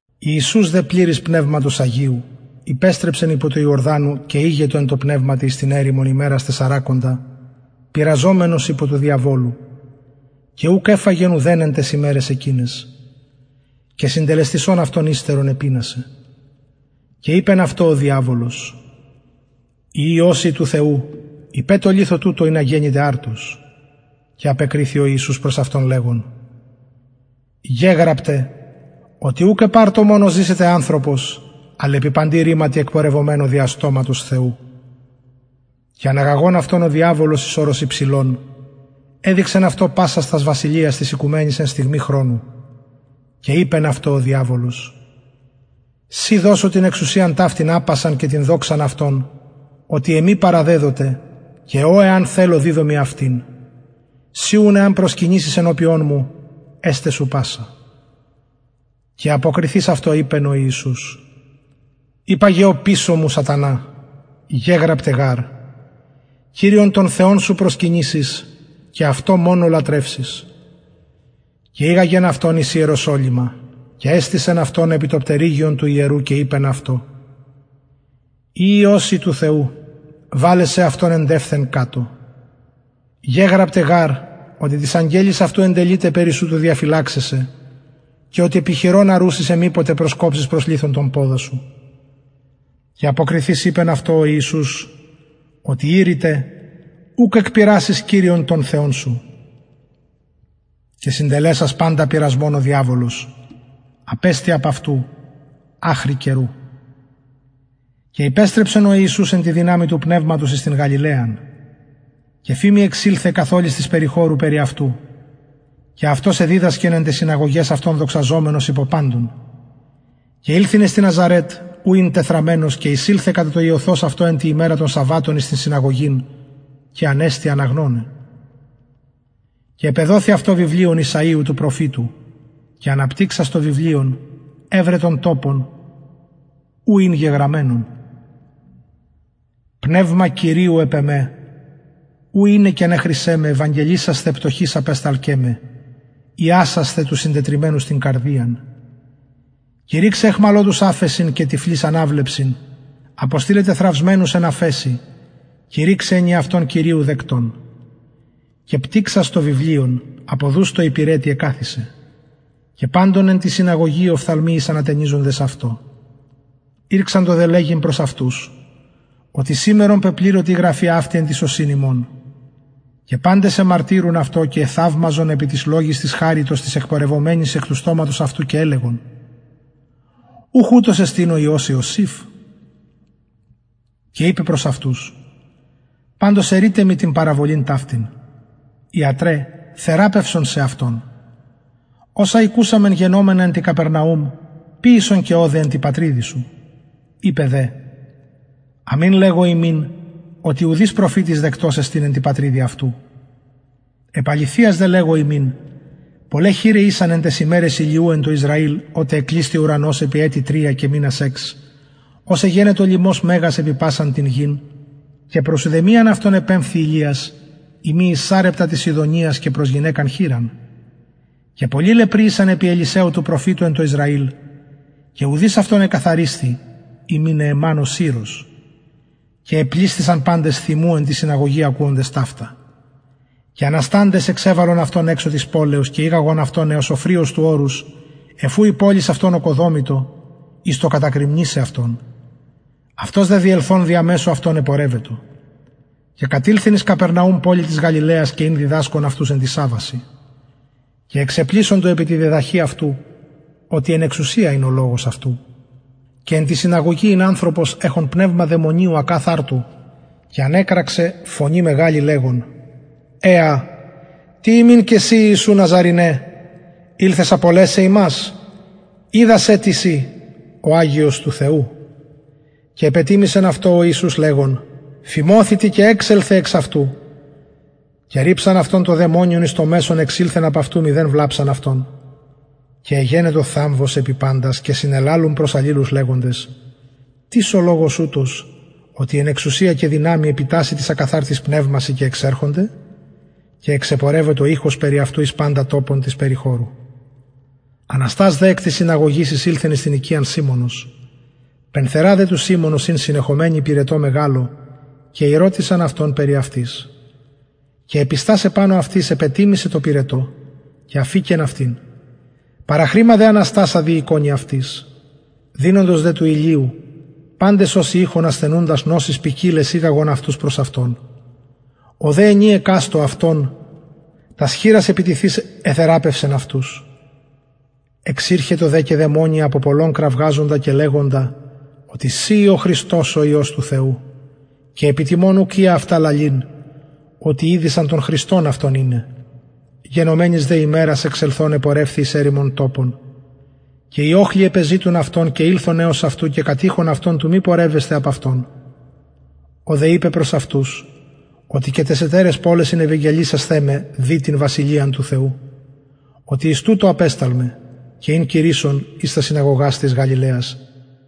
ιησους δε πνευματος αγιου πληρης υπεστρεψεν απο του ιορδανου και ηγετο εν τω πνευματι εις την ερημον ημερας τεσσαρακοντα πειραζομενος υπο του διαβολου και ουκ εφαγεν ουδεν εν ταις ημεραις εκειναις και συντελεσθεισων αυτων υστερον επεινασεν και ειπεν αυτω ο διαβολος ει υιος ει του θεου ειπε τω λιθω τουτω ινα γενηται αρτος και απεκριθη ιησους προς αυτον λεγων γεγραπται οτι ουκ επ αρτω μονω ζησεται ανθρωπος αλλ επι παντι ρηματι θεου και αναγαγων αυτον ο διαβολος εις ορος υψηλον εδειξεν αυτω πασας τας βασιλειας της οικουμενης εν στιγμη χρονου και ειπεν αυτω ο διαβολος σοι δωσω την εξουσιαν ταυτην απασαν και την δοξαν αυτων οτι εμοι παραδεδοται και ω εαν θελω διδωμι αυτην συ ουν εαν προσκυνησης ενωπιον εμου εσται σου πασα και αποκριθεις αυτω ειπεν ο ιησους υπαγε οπισω μου σατανα γεγραπται προσκυνησεις κυριον τον θεον σου και αυτω μονω λατρευσεις και ηγαγεν αυτον εις ιερουσαλημ και εστησεν αυτον επι το πτερυγιον του ιερου και ειπεν αυτω ει υιος ει του θεου βαλε σεαυτον εντευθεν κατω γεγραπται γαρ οτι τοις αγγελοις αυτου εντελειται περι σου του διαφυλαξαι σε και επι χειρων αρουσιν σε μηποτε προσκοψης προς λιθον τον ποδα σου και αποκριθεις ειπεν αυτω ο ιησους οτι ειρηται ουκ εκπειρασεις κυριον τον θεον σου και συντελεσας παντα πειρασμον ο διαβολος απεστη απ αυτου αχρι καιρου και υπεστρεψεν ο ιησους εν τη δυναμει του πνευματος εις την γαλιλαιαν και φημη εξηλθεν καθ ολης της περιχωρου περι αυτου και αυτος εδιδασκεν εν ταις συναγωγαις αυτων δοξαζομενος υπο παντων και ηλθεν εις την ναζαρετ ου ην τεθραμμενος και εισηλθεν κατα το ειωθος αυτω εν τη ημερα των σαββατων εις την συναγωγην και ανεστη αναγνωναι και επεδοθη αυτω βιβλιον ησαιου του προφητου και αναπτυξας το βιβλιον ευρεν τον τοπον ου ην γεγραμμενον πνευμα κυριου επ εμε ου εινεκεν εχρισεν με ευαγγελισασθαι πτωχοις απεσταλκεν με ιασασθαι τους συντετριμμενους την καρδιαν κηρυξαι αιχμαλωτοις αφεσιν και τυφλοις αναβλεψιν αποστειλαι τεθραυσμενους εν αφεσει κηρυξαι ενιαυτον κυριου δεκτον και πτυξας το βιβλιον αποδους τω υπηρετη εκαθισεν και παντων εν τη συναγωγη οι οφθαλμοι ησαν ατενιζοντες αυτω ηρξατο δε λεγειν προς αυτους οτι σημερον πεπληρωται η γραφη αυτη εν τοις ωσιν υμων και παντες εμαρτυρουν αυτω και εθαυμαζον επι τοις λογοις της χαριτος τοις εκπορευομενοις εκ του στοματος αυτου και ελεγον ουχ ουτος εστιν ο υιος ιωσηφ και ειπεν προς αυτους παντως ερειτε μοι την παραβολην ταυτην ιατρε θεραπευσον σεαυτον οσα ηκουσαμεν γενομενα εν τη καπερναουμ ποιησον και ωδε εν τη πατριδι σου ειπεν δε αμην λεγω υμιν οτι ουδεις προφητης δεκτος εστιν εν τη πατριδι αυτου επ αληθειας δε λεγω υμιν πολλαι χηραι ησαν εν ταις ημεραις ηλιου εν τω ισραηλ οτε εκλεισθη ο ουρανος επι ετη τρια και μηνας εξ ως εγενετο λιμος μεγας επι πασαν την γην και προς ουδεμιαν αυτων επεμφθη ηλιας ει μη εις σαρεπτα της σιδωνος προς γυναικα χηραν και πολλοι λεπροι ησαν επι ελισσαιου του προφητου εν τω ισραηλ και ουδεις αυτων εκαθαρισθη ει μη νεεμαν ο συρος και επλησθησαν παντες θυμου εν τη συναγωγη ακουοντες ταυτα και ανασταντες εξεβαλον αυτον εξω της πολεως και ηγαγον αυτον εως οφρυος του ορους εφ ου η πολις αυτων ωκοδομητο εις το κατακρημνισαι αυτον αυτος δε διελθων δια μεσου αυτων επορευετο και κατηλθεν εις καπερναουμ πολιν της γαλιλαιας και ην διδασκων αυτους εν τοις σαββασιν και εξεπλησσοντο επι τη διδαχη αυτου οτι εν εξουσια ην ο λογος αυτου και εν τη συναγωγη ην ανθρωπος εχων πνευμα δαιμονιου ακαθαρτου και ανεκραξεν φωνη μεγαλη λεγων εα τι ημιν και σοι ιησου ναζαρηνε ηλθες απολεσαι ημας οιδα σε τις ει ο αγιος του θεου και επετιμησεν αυτω ο ιησους λεγων φιμωθητι και εξελθε εξ αυτου και ριψαν αυτον το δαιμονιον εις μεσον εξηλθεν απ αυτου μηδεν βλαψαν αυτον και εγενετο θαμβος επι παντας και συνελαλουν προς αλληλους λεγοντες τις ο λογος ουτος οτι εν εξουσια και δυναμει επιτασσει τοις ακαθαρτοις πνευμασιν και εξερχονται και εξεπορευετο ηχος περι αυτου εις παντα τοπον της περιχωρου αναστας δε εκ της συναγωγης εισηλθεν εις την οικιαν σιμωνος πενθερα δε του σιμωνος ην συνεχομενη πυρετω μεγαλω και ηρωτησαν αυτον περι αυτης και επιστας επανω αυτης επετιμησεν τω πυρετω και αφηκεν αυτην παραχρημα δε αναστασα διηκονει αυτοις δυνοντος δε του ηλιου παντες οσοι ειχον ασθενουντας νοσοις ποικιλαις ηγαγον αυτους προς αυτον ο δε ενι εκαστω αυτων τας χειρας επιθεις εθεραπευσεν αυτους εξηρχετο δε και δαιμονια απο πολλων κραζοντα και λεγοντα οτι συ ει ο χριστος ο υιος του θεου και επιτιμων ουκ εια αυτα λαλειν οτι ηδεισαν τον χριστον αυτον ειναι γενομενης δε ημερας εξελθων επορευθη εις ερημον τοπον και οι οχλοι επεζητουν αυτον και ηλθον εως αυτου και κατειχον αυτον του μη πορευεσθαι απ αυτων ο δε ειπεν προς αυτους οτι και ταις ετεραις πολεσιν ευαγγελισασθαι με δει την βασιλειαν του θεου οτι εις τουτο απεσταλμαι και ην κηρυσσων εν ταις συναγωγαις της γαλιλαιας